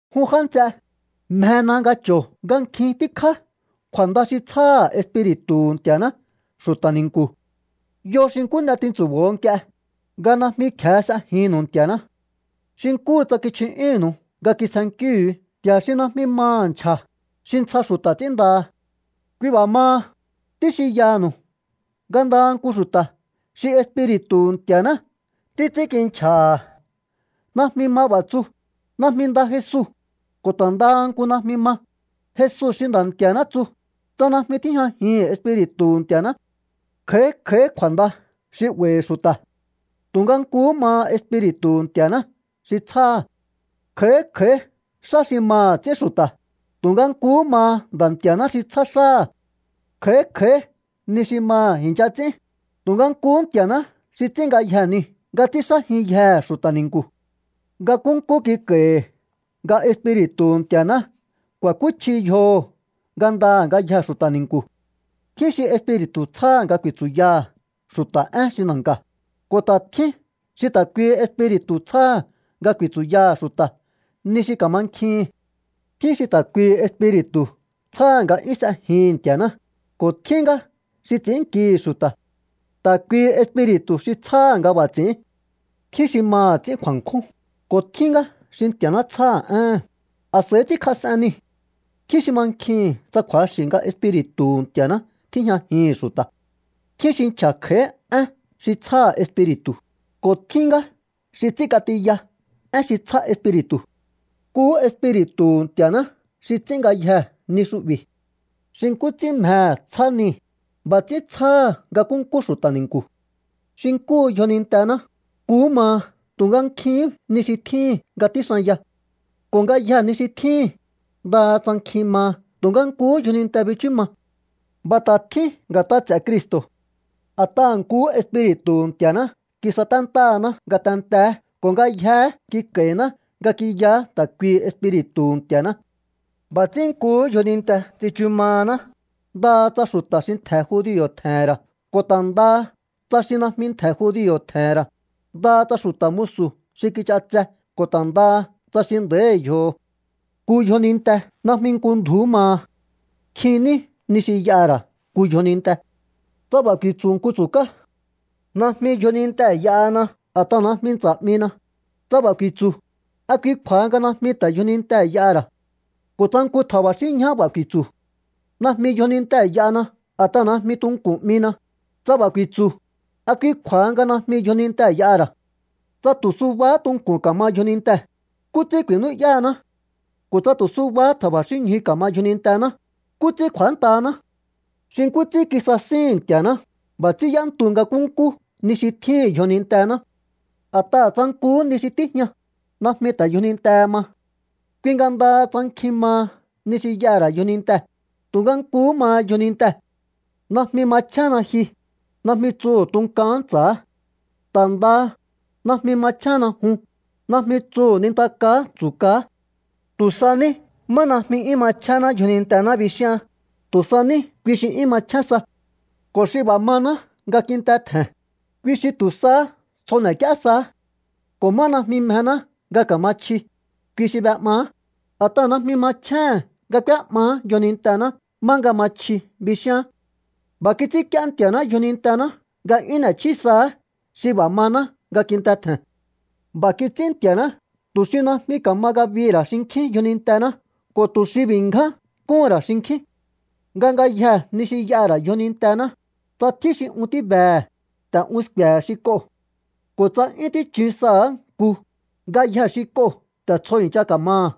Jun já nts'e, mjena nga cho̱o nga nkjin tíkjá kju̱a̱nda xi tsjáha̱ Espiri̱tu̱hu̱ Nti̱a̱ná xu̱ta̱ ni̱nku̱. Yo xi nkú n'e tintsu̱bo̱o nk'ie, nga najmi kje̱e s'ejinnu̱u Nti̱a̱ná. Xi nkúhu tsa kichju'yúnnu̱u nga kitsjennkíhu̱u nti̱a̱ xi najmi maha̱ nchja̱, xi ntsja xu̱ta̱ ts'ínndaha. Kui b'a̱ maha, tíxinyaha̱nu̱u nga ndaha nku xu̱ta̱ xi Espiri̱tu̱hu̱ Nti̱a̱ná títs'ínkinchja̱ha̱ najmi ma b'a̱ tsu: “¡Najmi nda Jesu!” Ko̱ ta̱ ndaha nku najmi ma: “¡Jesu xi Nda̱ Nti̱a̱ná!” tsu, tsa najmi tíjñajihi̱n Espiri̱tu̱hu̱ Nti̱a̱ná. Kj'a̱í kj'a̱í kju̱a̱nda xi 'ba̱i̱hi̱ xu̱ta̱, tu̱nga nkuhú maha Espiri̱tu̱hu̱ Nti̱a̱ná xi tsjáha̱. Kj'a̱í kj'a̱í xá xi maha̱ ts'ín xu̱ta̱, tu̱nga nkuhú maha Nda̱ Nti̱a̱ná xi tsjá xáha̱. Kj'a̱í kj'a̱í ni xi maha̱ i̱ncha ts'ín, tu̱nga nkuhú Nti̱a̱ná xi ts'ín ngayjee̱ niu̱ nga ts'ínxájinyjehe̱ xu̱ta̱ ni̱nku̱. Nga nkúnkú kik'a̱i̱hi̱ nga Espiri̱tu̱hu̱ Nti̱a̱ná ku̱a̱kúchji yjoho̱ ngandaha̱ ngayjee̱ xu̱ta̱ ni̱nku̱. Tjín xi Espiri̱tu̱ tsjáha̱ nga ku̱i̱tsu̱yaha̱ xu̱ta̱ én xi na̱nka̱, ko̱ ta̱ tjín xi ta̱ kuihi Espiri̱tu̱ tsjáha̱ nga ku̱i̱tsu̱yaha̱ xu̱ta̱ ni xi ka̱mankjihi̱n. Tjín xi ta̱ kuihi Espiri̱tu̱ tsjáha̱ nga 'yún s'ejihi̱n Nti̱a̱ná, ko̱ tjín ngá xi ts'i̱ínnkihi̱ xu̱ta̱. Ta̱ kuihi Espiri̱tu̱ xi tsjáha̱ nga b'a̱ ts'i̱ín. Tjín xi maha̱ ts'ín kju̱a̱nkjún, ko̱ tjín ngá xi Nti̱a̱ná tsjáha̱ éhe̱n, a̱s'a̱i ts'ínkjas'en niu̱. Tjín xi mankjihi̱n tsa kju̱axi̱ nga Espiri̱tu̱hu̱ Nti̱a̱ná tíjñajihi̱n xu̱ta̱. Tjín xi nchja̱ kj'a̱í én xi tsjáha̱ Espiri̱tu̱, ko̱ tjín ngá xi ts'ínk'atiya én xi tsjá Espiri̱tu̱. Nkuhú Espiri̱tu̱hu̱ Nti̱a̱ná xi ts'ín ngayjee̱ ni xu'bi̱. Xi nkú ts'ín mjehe̱ tsjá nii̱, b'a̱ ts'ín tsjáha̱ nga nkúnkú xu̱ta̱ ni̱nku̱. Xi nkúhu yjonintená, nkuhú maha tu̱nga nkjihín ni xi tjíhi̱n nga tjíxanya. Ko̱ ngayjee̱ ni xi tjíhi̱n, ndaha tsa nkjin maha tu̱nga nkuhú yjoninte bichú ma. B'a̱ ta̱ tjín nga̱t'a ts'e̱ Cristo̱. A̱t'aha̱ nkuhú Espiri̱tu̱hu̱ Nti̱a̱ná kisaténtáhaná ngatenteé ko̱ ngayjeé kik'a̱i̱ná nga ki'yaá ta̱ kuihi Espiri̱tu̱hu̱ Nti̱a̱ná. B'a̱ ts'ín nkuhú yjoninte tsichu mahaná, ndaha tsa xu̱ta̱ xi ntje̱ judio̱ tje̱he̱n ra̱ ko̱ ta̱ ndaha tsa xi najmi ntje̱ judio̱ tje̱he̱n ra̱, ndaha tsa xu̱ta̱ musu̱ xi kich'atse ko̱ ta̱ ndaha tsa xi nda̱í yjoho̱. Nku yjoninte najmi nku ndju̱ú maha. Nkjin ní ni xi y'aha̱ ra̱ nku yjoninte. Tsa b'a̱ ku̱i̱tsu̱ nku tsu̱kaá: “Najmi yjonintee̱ y'ahana a̱t'aha̱ najmi ntsa̱ 'mina”, tsa b'a̱ ku̱i̱tsu̱, ¿a kui kju̱a̱ha nga najmi ta̱ yjonintee̱ y'aha̱ ra̱? Ko̱ tsa nku tja̱ba̱xínñjaá b'a̱ ku̱i̱tsu̱: “Najmi yjonintee̱ y'ahana a̱t'aha̱ najmi tunku̱n 'mina”, tsa b'a̱ ku̱i̱tsu̱, ¿a kui kju̱a̱ha nga najmi yjonintee̱ y'aha̱ ra̱? Tsa tu̱ subahá tunku̱n ka̱ma yjonintee̱, ¿nkú ts'ín ku̱i̱nú'yáhaná? Ko̱ tsa tu̱ subahá tja̱ba̱xínñju ka̱ma yjonintená, ¿nkú ts'ín kj'u̱ántahaná? Xi nkú ts'ín kisasíhi̱n Nti̱a̱ná, b'a̱ ts'ín y'éntu nga nkúnkú ni xi tjíhi̱n yjonintená. A̱t'aha̱ tsa nkuhú ni xi tíjña, najmi ta̱ yjonintehe ma. Kui nga ndaha tsa nkjin maha ni xi y'aha̱ ra̱ yjonintee̱, tu̱nga nkuhú maha yjonintee̱. “Najmi machjénna ji”, najmi tsuhu̱ tunkaán ntsa̱á. Ta̱ ndaha: “Najmi machjénna jun”, najmi tsuhu̱ nintakaá tsu̱kaá. Tu̱ sa ní má najmi 'yún machjénná yjonintená bixíhaán, tu̱ sa ní kui xi 'yún machjén sa. Ko̱ xi b'a̱ maná nga kinte tje̱n, kui xi tu̱ sahá tsjo n'ek'íé saá. Ko̱ má najmi mjená nga ka̱ma chji, kui xi b'e'maá, a̱t'aha̱ najmi machjéhe̱n nga k'úé'maá yjonintená má nga ma chji bixíaán. B'a̱ kits'ínk'íé Nti̱a̱ná yjonintená nga 'yún n'e̱chjí saá xi b'a̱ maná nga kinte tje̱n. B'a̱ kits'ín Nti̱a̱ná tu̱ xi najmi ka̱ma ngabihi̱ ra̱ xinkjín yjonintená ko̱ tu̱ xi b'i̱ ngján kúhu̱n ra̱ xinkjín. Nga ngayjee̱ ni xi y'aha̱ ra̱ yjonintená, tsa tjín xi un tíbehe̱, ta̱ un sku̱e̱he̱ xi k'oo̱. Ko̱ tsa 'yún tíchun saha̱á nku, ngayjee̱ xi k'oo̱ ta̱ tsjo i̱ncha ka̱maha̱.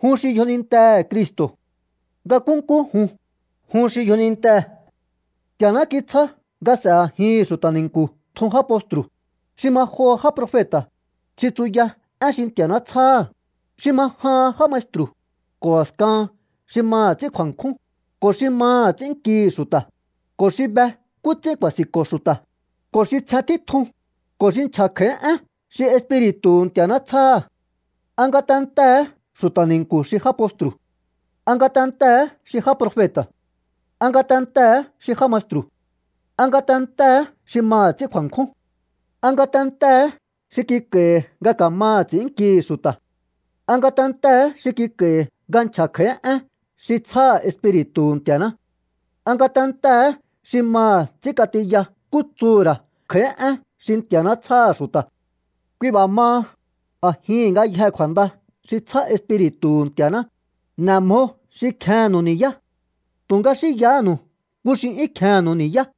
Jun xi yjonintehe̱ Cristo̱. Nga nkúnkú jun, jun xi yjonintee̱. Nti̱a̱ná kitsjá nga s'e̱ a̱jihi̱n xu̱ta̱ ni̱nku̱ tjun já postru̱, xi ma joho já profeta̱ xi tsuya én xi Nti̱a̱ná tsjáha̱, xi ma jahan já maestru̱, ko̱ a̱skahan xi maha̱ ts'ín kju̱a̱nkjún, ko̱ xi maha̱ ts'ínnkihi̱ xu̱ta̱, ko̱ xi be nkú ts'ín ku̱a̱si̱nko̱ xu̱ta̱, ko̱ xi tsjen títjun, ko̱ xi nchja̱ kj'a̱í én xi Espiri̱tu̱hu̱ Nti̱a̱ná tsjáha̱. ¿A ngatentee̱hé xu̱ta̱ ni̱nku̱ xi já postru̱? ¿A ngatentee̱hé xi já profeta̱? ¿A ngatentee̱hé xi já maestru̱? ¿A ngatentee̱hé xi maha̱ ts'ín kju̱a̱nkjún? ¿A ngatentee̱hé xi kik'a̱i̱hi̱ nga ka̱maha̱ ts'i̱ínnkihi̱ xu̱ta̱? ¿A ngatentee̱hé xi kik'a̱i̱hi̱ nga nchja̱ kj'a̱í én xi tsjáha̱ Espiri̱tu̱hu̱ Nti̱a̱ná? ¿A ngatentee̱hé xi maha̱ ts'ínk'atiya nkú tsuhu̱ ra̱ kj'a̱í én xi Nti̱a̱ná tsjáha̱ xu̱ta̱? Kui b'a̱ maha, a̱jihi̱n ngayjee̱ kju̱a̱nda xi tsjá Espiri̱tu̱hu̱ Nti̱a̱ná, n'e̱ mjo xi kjennu̱u ni̱yá. Tu̱nga xínyahánu̱u nku xi 'yún kjennu̱u ni̱yá.